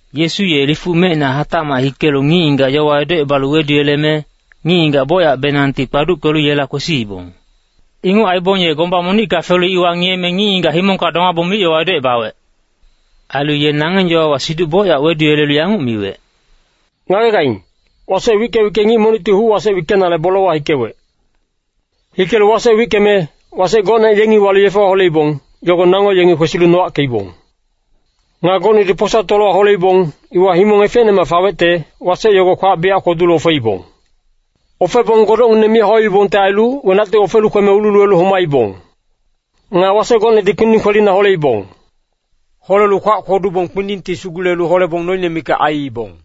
Yesu ye lifuc mecina hatacmac hikelu ngic-ngigac yowa edocebalu weduyeleme, ngic-ngigac bocyacbenangti kpaduckelu yela kwesiibong. Inguc aibong ye gomba monicka felu iwa ngiyeme, ngic-ngigac himongka domabong mic-yowa edocebawec. Ailu ye nangeng yowawa siduc bocyac weduyelelu yanguc miwec, “Ngagegaing, wasec wicke-wicke ngic monicti huc-wasec wickenale bolewa hikewec. Hikelu wasec wickeme, wasec gocne yengi walu yefewa holeibong, yogo nango yengi kwesilu nowackeibong. Nga gocnedi posa tolowa holeibong, iwa himong efecnemac fawecte, wasec yogo kwac biyac kwodulu ofeibong. Ofebong godocngineng mi hauibongte ailu, wenacti ofelu kweme ululuwelu homaibong. Nga wasec gocnedi kpinding kwelina holeibong. Holelu kwac kwodubong kpindingti sugulelu holebong noine mikac aiibong.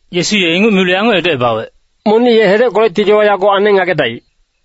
Yesu ye inguc milu yanguc edocebawec, “Monic ye hedeckolecti yowa yago aneng ngagedaic.”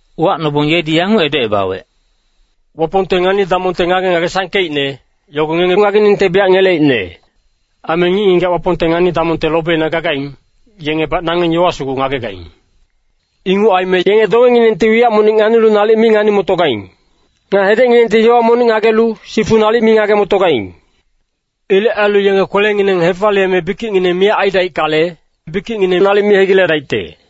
Uwacnobong yedi yanguc edocebawec, “Wapongte ngani-damongte ngage-ngage sangkeicne, yogo ngengi ngageningte biyac ngeleicne. Aime ngic-ngigac Wapongte ngani-damongte lobina gagaing, yengebac nangeng yowa sugu ngagegaing. Inguc aime ‘Yenge dongenginengti wiyac monic nganilu nalic mi ngani-motogaing. Nga hedecnginengti yowa monic ngagelu, sifu nalic mi ngage-motogaing. Ilec ailu yenge kwelengineng hefaliyeme bikicngineng miyac aidaickale, bikicngineng nalic mi hegiledaicte.’”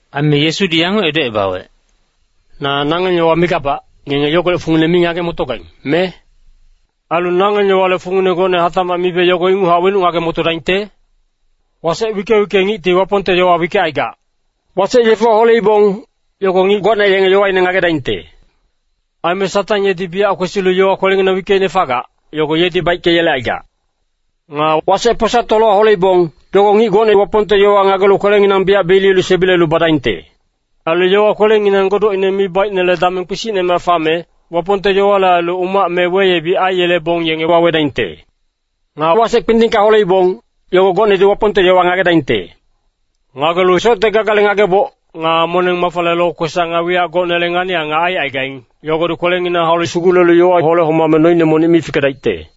Aime Yesudi yanguc edocebawec, “Na nangeng yowa migabac, ngenge yogolec fungine mi ngage-motogaing, me? Ailu nangeng yowale fungine gocne hatacmac mibe yogo inguchac wenuc ngage-motodaingte? Wasec wicke-wicke ngicti Wapongte yowa wickecaigac. Wasec yefewa holeibong, yogo ngic gocne yenge yowaine ngagedaingte. Aime Satang yedi biyac kwesilu yowa kwelenginang wickeicne fagac, yogo yedi baickeyelecaigac. “Nga wasec posa tolowa holeibong, yogo ngic gocne Wapongte yowa ngagelu kwelenginang biyac beliyelu sebilelu badaingte. Ailu yowa kwelenginang godocine mi baicnele dameng kpisicnemac fame, Wapongte yowale ailu umac me weyebic aiyelebong yenge wawedaingte. “Nga wasec kpindingka holeibong, yogo gocnedi Wapongte yowa ngagedaingte. Ngagelu socte gagale ngageboc, nga moneng-mafale lokwesac nga wiyac gocnele ngani-angac aicaigaing, yogodi kwelenginang haulu sugulelu yowa hole-homame noine monic mi fikedaicte.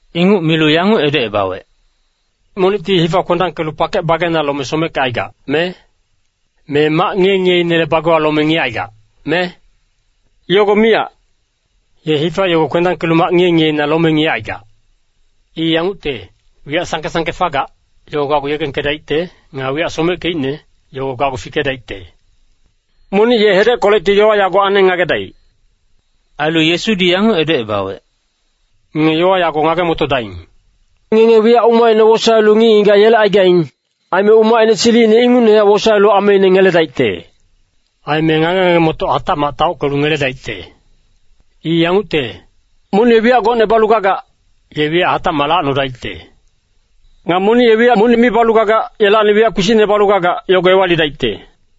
Inguc milu yanguc edocebawec, “Monicti hifa kwendangkelu pakec bageina lome someckecaigac, me? Me mac ngiye-ngiyeinele bagewa lome ngiyecaigac, me? Yogo miyac! Ye hifa yogo kwendangkelu mac ngiye-ngiyeina lome ngiyecaigac. I yangucte, wiyac sangke-sangke fagac, yogo gacgu yegengkedaicte. Nga wiyac someckeicne, yogo gacgu fikedaicte. Monic ye hedeckolecti yowa yago aneng ngagedaic.” Ailu Yesudi yanguc edocebawec, “Ngenge yowa yago ngage-motodaing. Ngenge wiyac umacine wosaelu ngic-ngigac yelecaigaing, aime umacine silicine ingucnehac wosaelu ameine ngeledaicte. Aime ngage-ngage-motoc hatacmac taockelu ngeledaicte. I yangucte, monic ye wiyac gocne balu gagac, ye wiyac hatacmac lacnodaicte. Nga monic ye wiyac monic mi balu gagac, yelacni wiyac kpisicne balu gagac, yogo ewalidaicte.”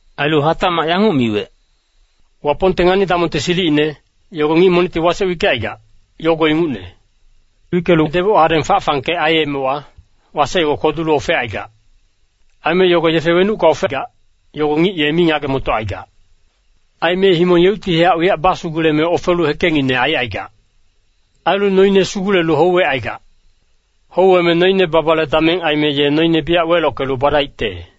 Ailu hatacmac yanguc miwec, “Wapongte ngani-damongte silicine, yogo ngic monicti wasec wickecaigac, yogo ingucne. Wickelu deboc hadeng fac-fangkec aiyemewa, wasec yogo kwodulu ofecaigac. Aime yogo yefe wenucka ofegac, yogo ngic ye mi ngage-motocaigac. Aime himong yeuctihac wiyac basuguleme ofelu hekengngine aicaigac. Ailu noine sugulelu houwecaigac. Houweme noine babale dameng aime ye noine biyac welockelu badaicte.”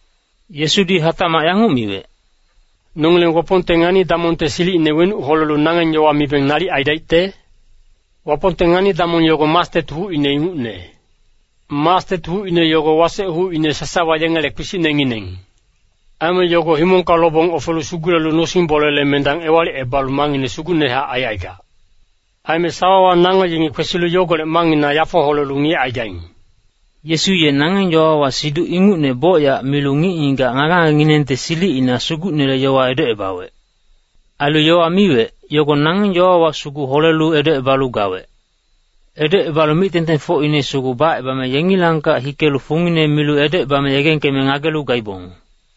Yesudi hatacmac yanguc miwec, “Nongileng Wapongte ngani-damongte silicine wenuc holelu nangeng yowa mibeng nalic aidaicte? Wapongte ngani-damong yogo mastet hucine ingucne. Mastet hucine yogo wasec hucine sasawa yengele kpisicnengineng. Aime yogo himongka lobong ofelu sugulelu nosing-bolele mendang ewalicebalu mangngine sugucnehac aicaigac. Aime sawawa nango yengi kwesilu yogolec mangngina yafo holelu ngiyecaigaing.” Yesu ye nangeng yowawa siduc ingucne bocyac milu ngic-ngigac ngage-ngagenginengte silicina Sugucnele yowa edocebawec. Ailu yowa miwec, yogo nangeng yowawa sugu holelu edocebalu gawec. Edocebalu mic-tengtengfocine sugu bacebame yengilangkac hikelu fungine milu edocebame yegengkeme ngagelu gaibong.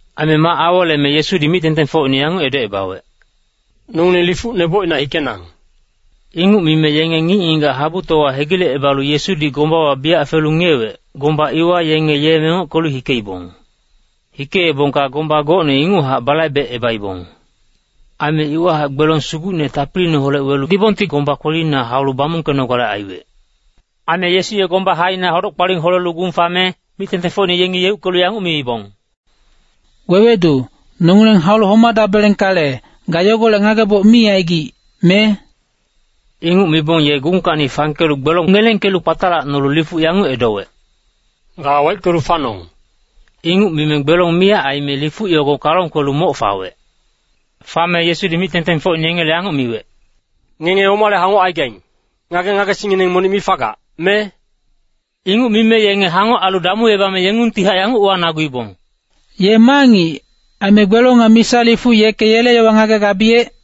Aime mac aweleme Yesudi mic-tengtengfocine yanguc edocebawec, “Nongileng lifuc nebocina hikenang.” Inguc mime yenge ngic-ngigac habutowa hegilecebalu Yesudi gombawa biyac felu ngiyewec, gomba iwa yenge ye mengockelu hikeibong. Hikeebongka gomba gocne inguchac balaibecebaibong. Aime iwahac gbelong sugucne tapiliineholec welu dibongti gomba kwelina haulu bamungkenogale aiwec. Aime Yesu ye gomba haina hodoc-kpaling holelu gung fame, mic-tengtengfocine yengi yeuckelu yanguc miibong, “Wewedu, nongileng haulu homadabelengkale, ga yogolec ngageboc mi aigic, me?” Inguc mibong ye gungkacni fangkelu gbelong ngelengkelu kpatalacnolu lifuc yanguc edowec, “Ga waickelu fanong!” Inguc mime gbelong miyac aime lifuc yogo kalong kwelu moc fawec. Fame Yesudi mic-tengtengfocine yengele yanguc miwec, “Ngenge omale hangoc aigaing, ngage-ngagesingngineng monic mi fagac, me?” Inguc mime yenge hangoc ailu damuebame yengungtihac yanguc uwanaguibong, “Ye ma ngic, aime gbelong nga misa lifuc yeke yele yowa ngagegabiyec?”